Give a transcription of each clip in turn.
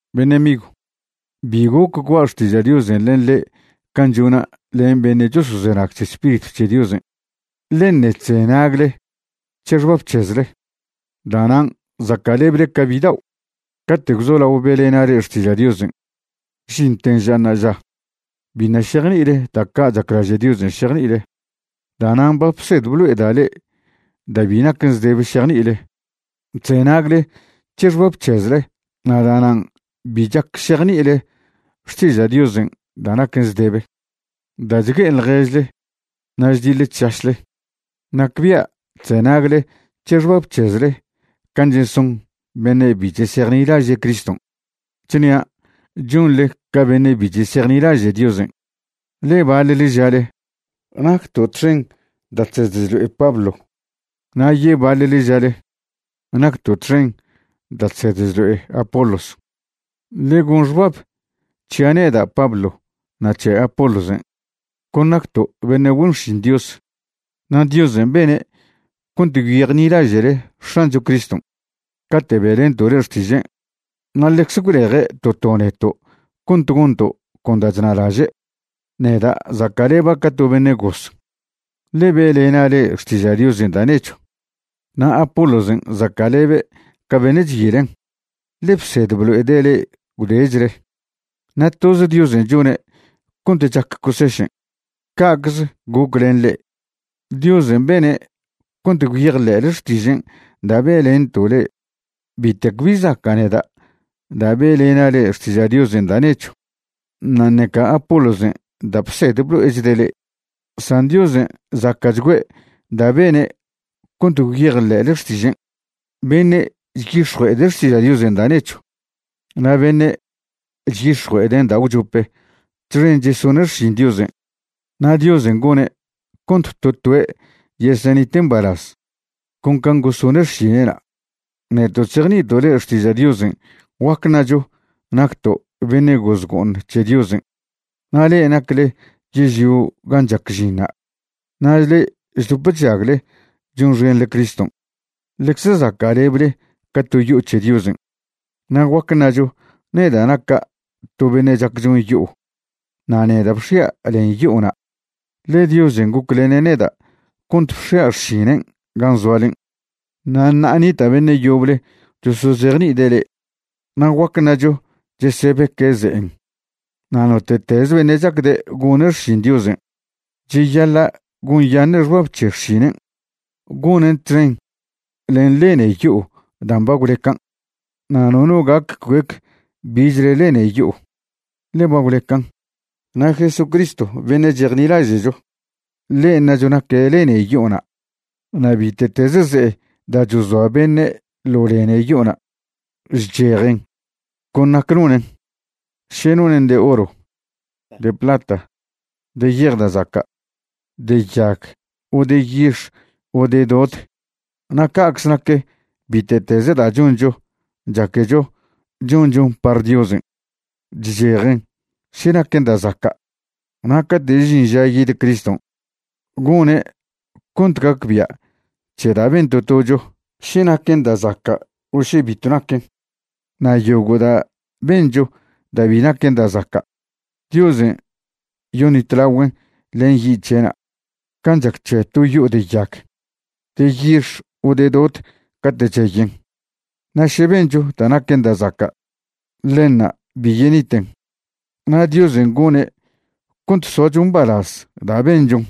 Beṉe' migw, bi goc gua' xtiža' Diosen' len le'e can' chona' len beṉe' chosozenag c̱he Spiritw c̱he Diosen', ḻe ṉe' chzenagle c̱he xbab c̱hezle. Da'nan' zaca'leble ca bidao'. Cate' gwzolao be'lena' le'e xtiža' Diosen' žinten ža ṉa'aža, biṉa' šejni'ile da' ca' chaclaže' Diosen' šejni'ile. Da'nan' ba bsed blo'eda' le'e da' bi naquen zdebe šejni'ile. Chzenagle c̱he xbab c̱hezle na' da'nan' bi chac šejni'ile xtiža' Diosen' da' naquen zdebe. Da' chgue'e ḻježle na' chdiḻe chšašle, nacbia' chzenagle c̱he xbab c̱hezle can' cheson beṉe' bi chesejnilaže' Criston'. Chnia' chonḻe ca beṉe' bi chesejnilaže' Diosen', ḻe baḻle žale: “Nacto' txen da' chsed chlo'e Pablo”, na' yebaḻle žale: “Nacto' txen da' chsed chlo'e Apolos.” Ḻe gon xbab c̱hia' neda' Pablo na' c̱he Apolosen', con nacto' beṉe' güen xšin Dios. Na' Diosen' bene' cont gwyejni'laže'le X̱ancho Criston' cate' be'lento' le'e xtižen', na' ḻecze gwleje' to to neto' cont gonto' con da' chnalaže'. Neda' zaca'leba' ca to beṉe' goz, ḻe be'lena' le'e xtiža' Diosen' da' nechw, na' Apolosen' zaca'lebe' ca' beṉe' chyilen, ḻe bsed blo'ede' le'e gwdechle. Na' toz Diosen' chone' cont chac cosešen'. Ca'cze goc len le'e, Diosen' bene' cont gwyejḻe'le xtižen' da' be'lento' le'e. Bitec bi zaca' neda' da' be'lena' le'e xtiža' Diosen' da' nechw, na' ṉeca Apolosen' da' bsed blo'echde' le'e, san Diosen' zaca'chgüe' da' bene' cont gwyejḻe'le xtižen'. Beṉe' chyix̱jue'ede' xtiža' Diosen' da' nechw na' beṉe' chyix̱jue'eden' da' gwchope txen chesone' xšin Diosen'. Na' Diosen' gone' cont to toe' yesenite' mbalaz con can' gosone' xšine'na'. Neto' chzejni'ito' le'e xtiža' Diosen', guac ṉacho nacto' beṉe' goz go'oṉ c̱he Diosen' na' le'e nacle yežlio gan' chac žinṉa'. Na' le'e chdop chžagle chonxenḻe Criston' ḻecze zaca'leble ca to yo'o c̱he Diosen'. Na' guac ṉacho neda' naca' to beṉe' chac chon yo'o na' neda' bx̱ia' len yo'ona', ḻe Diosen' goclene' neda' cont bx̱ia' xšinen' gan' zoalen'. Na' ṉa'a nita' beṉe' yoble chosozejni'ide' le'e, na' guac ṉacho chesebeque' ze'en. Na' note'teze beṉe' chacde' gone' xšin Diosen' cheyaḻa' gonyaṉe' xbab še xšinen' gonen txen len lene yo'o dan' ba gwlecan'. Na' nono gac cuec bichle lene yo'o, ḻe ba gwlecan', na' Jesucristo beṉe' chejnilaže'cho, ḻen' ṉacho naque' lene yo'ona'. Na' bite'teze ze'e da' chozoa beṉe' ḻo lene yo'ona', chchejen con nac nonen', še nonen' de oro, de plata, de yej da' zaca', de yag o de yix o de dod. Na' ca'cze nac bite'teze da' choncho chaquecho chonchon par Diosen', chchejen še naquen da' zaca'. Na' cate' žin ža yid Criston', gone' cont gacbia' c̱he da' ben to tocho še naquen da' zaca' o še bitw naquen. Na' yogo' da' bencho da' bi naquen da' zaca', Diosen' yoṉitlagüen' len yi' c̱he'na' can' chac c̱he to yo'o de yag, de yix o de dod cate' cheyen. Na' še bencho da' naquen da' zaca', ḻenṉa' bi yeniten, na' Diosen' gone' cont soacho mbalaz da' benchon.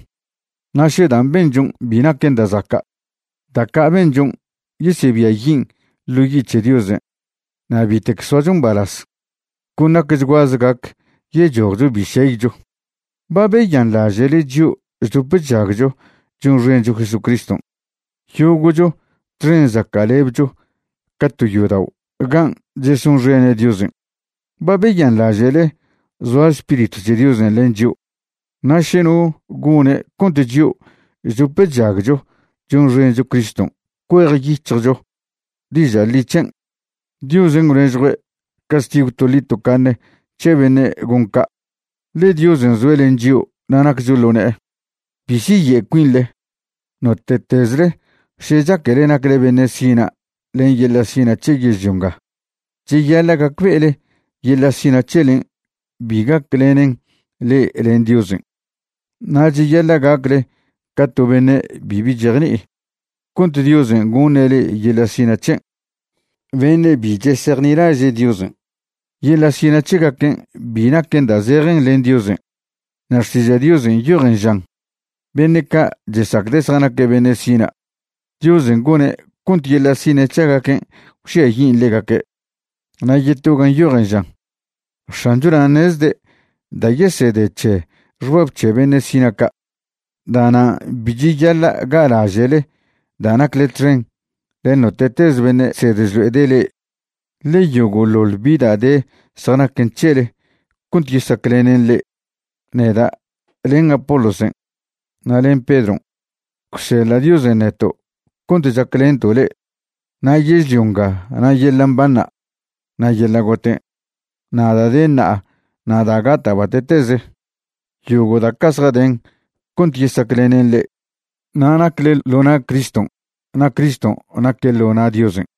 Na' še dan' benchon' bi naquen da' zaca', da' ca' benchon' yesebiayin' ḻo yi' c̱he Diosen' na' bitec soacho mbalaz, con nacchguaze gac yechojcho bi šeycho. ¿Ba beyanḻaže'le chio' chdop chžagcho chonxencho Jesucriston' yogo'cho txen zaca'lebcho ca to yodao' gan' chesonxene' Diosen'? ¿Ba beyanḻaže'le zoa Spiritw c̱he Diosen' len chio'? Na' še no gone' cont chio' chdop chžagcho chonxencho Criston' cuejyic̱hjcho diža' ḻi c̱hen', Diosen' gwnežjue' castigw toḻi tocaṉe c̱he beṉe' gon ca', ḻe Diosen' zoe' len chio' na' naccho ḻo ne'e. Bi siye' cuinḻe. Note'tezle še chaquele nacle beṉe' sina' len yeḻa' sina' c̱he yežlio nga, cheyaḻa' gacbe'ele yeḻa' sina' c̱helen' bi gaclenen le'e len Diosen'. Na' cheyaḻa' gacle ca to beṉe' bibi chejni'i cont Diosen' goṉe' le'e yeḻa' sina' c̱hen'. Beṉe' bi chesejnilaže' Diosen', yeḻa' sina' c̱hegaquen' bi naquen da' zejen len Diosen'. Na' Xtiža' Diosen' nyojen žan: “Beṉe' ca' chesacde' zjanaque' beṉe' sina', Diosen' gone' cont yeḻa' sina' c̱hegaquen' gwžiayin' ḻegaque'.” Na' yeto gan' nyojen žan: “X̱ancho nan' ṉezde' da' yesede c̱he xbab c̱he beṉe' sina' ca'.” Da'nan' bi cheyaḻa' ga'laže'le da' nacle txen len note'teze beṉe' chsed chlo'ede' le'e, ḻe yogo'ḻoḻ bi da' de zjanaquen c̱hele cont yesaclenen le'e. Neda', len Apolosen', na' len Pedron', gwseḻa' Diosen' neto' cont chaclento' le'e. Na' yežlio nga na' yeḻa' mbanṉa', na' yeḻa' goten', na' da' de ṉa'a na' da' gata' bate'teze, yogo' da' ca' zjaden cont yesaclenen le'e. Na' nacle ḻo na' Criston' na' Criston' naque' ḻo na' Diosen'.